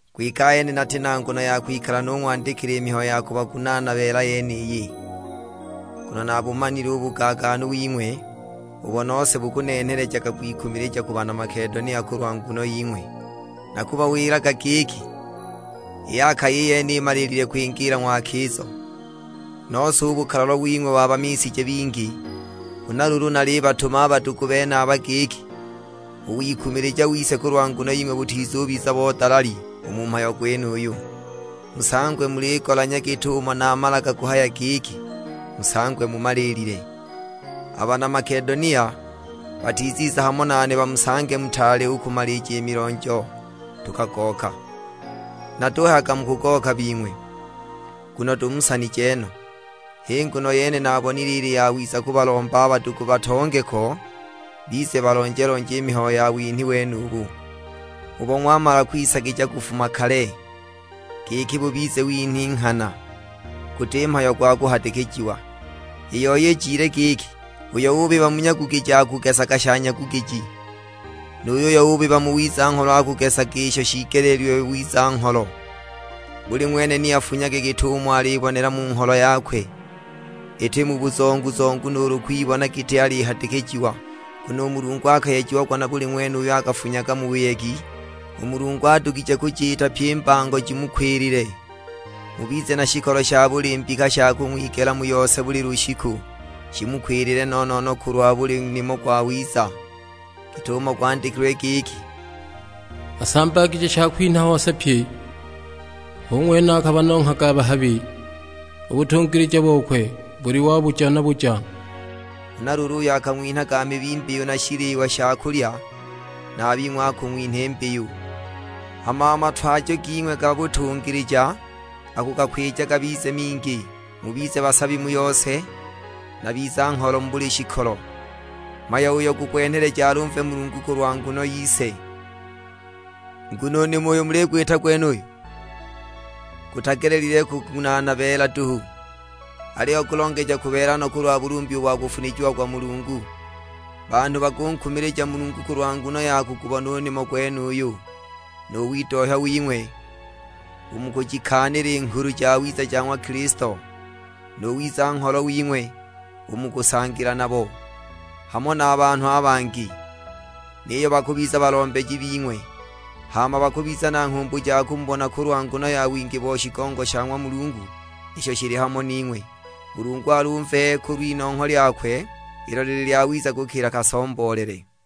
Kwike ahene nati na nguno ya kwikala nung'wandikila i mihayo ya kubagunaana beela yeniyi. Nguno nabumanile u bugaagaanu wing'we, ubo nose bukunenhelejaga kwikumilija ku bana Makedonia kulwa nguno ying'we. Nakubawilaga giki, i Akaya i yene imaliilile kwingiila ng'wakizo; nose u bukalalwa wing'we wabamishije bingi. Huna luulu nalibatuma a badugu benaba giki u wikumilija wise kulwa nguno ying'we butizubiza bo dalali u mu mhayo gwenuyu, musangwe muligolanya git'umo namalaga kuhaya giki, musangwe mumaliilile. A bana Makedonia batiziza hamo nane bamusange mutaali u kumalija i milonjo tukagooka; natuhayaga mukugooka bing'we, nguno tumusanije no. H'i nguno yene naabonile ili yawiza kubalomba a badugu batonge ko, bize balonje-lonje i mihayo ya winhi wenubu, ubo ng'wamala kwisagija kufuma kale; giki bubize winhi nghana, guti mhayo gwa kuhadikijiwa. I yoi ijile giki, uyo ubiba mu nyagugiji akugesa sha nyagugiji, nu yuyo ubiba mu wiza-ngholo akugesa isho shiigeleelilwe wiza-ngholo. Buli ng'wene ni afunyage git'umo alibonela mu ngholo yakwe; iti mu buzongu-zongu nuulu kwibona giti alihadikijiwa. Nguno u Mulungu akayejiagwa na buli ng'wene uyo akafunyaga mu buyegi. U Mulungu adugije kujiita pyi i mbango jimukwilile, mubize na shikolo sha buli mbika sha kung'wigela mu yose buli lushiku, shimukwilile no-no-no kulwa buli nimo gwawiza. Git'umo gwandikilwe giki, "Asambagije shakwinha hose pye; hu ng'wene akabanonghaga a bahabi, u butungilija bokwe buli wa buja na buja." Huna luulu uyo akang'winhaga mibi mbiyu na shiliwa sha kulya, na a bing'we akung'winha i mbiyu. Hama a matwajo ging'we ga butungilija akugakwija gabize mingi; mubize basabi mu yose, na biza-ngholo mu buli shikolo; mhayo uyo gukwenheleja alumve Mulungu kulwa nguno yise. Iki u nimo uyo muligwita gwenuyu gutagelelile ha kugunaana beela duhu, aliyo gulongeja kubeela no kulwa bulumbi ubo akufunijiagwa Mulungu. Banhu bakunkumilija Mulungu kulwa nguno ya kugubona u nimo gwenuyu, nu widohya wing'we u mu kujikaanila i Nghulu Jawiza ja ng'wa Kilisto, nu wiza-ngholo wing'we u mu kusangila nabo, hamo na a banhu a bangi. Niyo bakubiza balombeji bing'we; hama bakubiza na nghumbu ja kumubona kulwa nguno ya wingi bo shigongo sha ng'wa Mulungu isho shili hamo ning'we. Mulungu alumve kulw'inongho lyakwe ilo lili lyawiza kukila kasomboolele.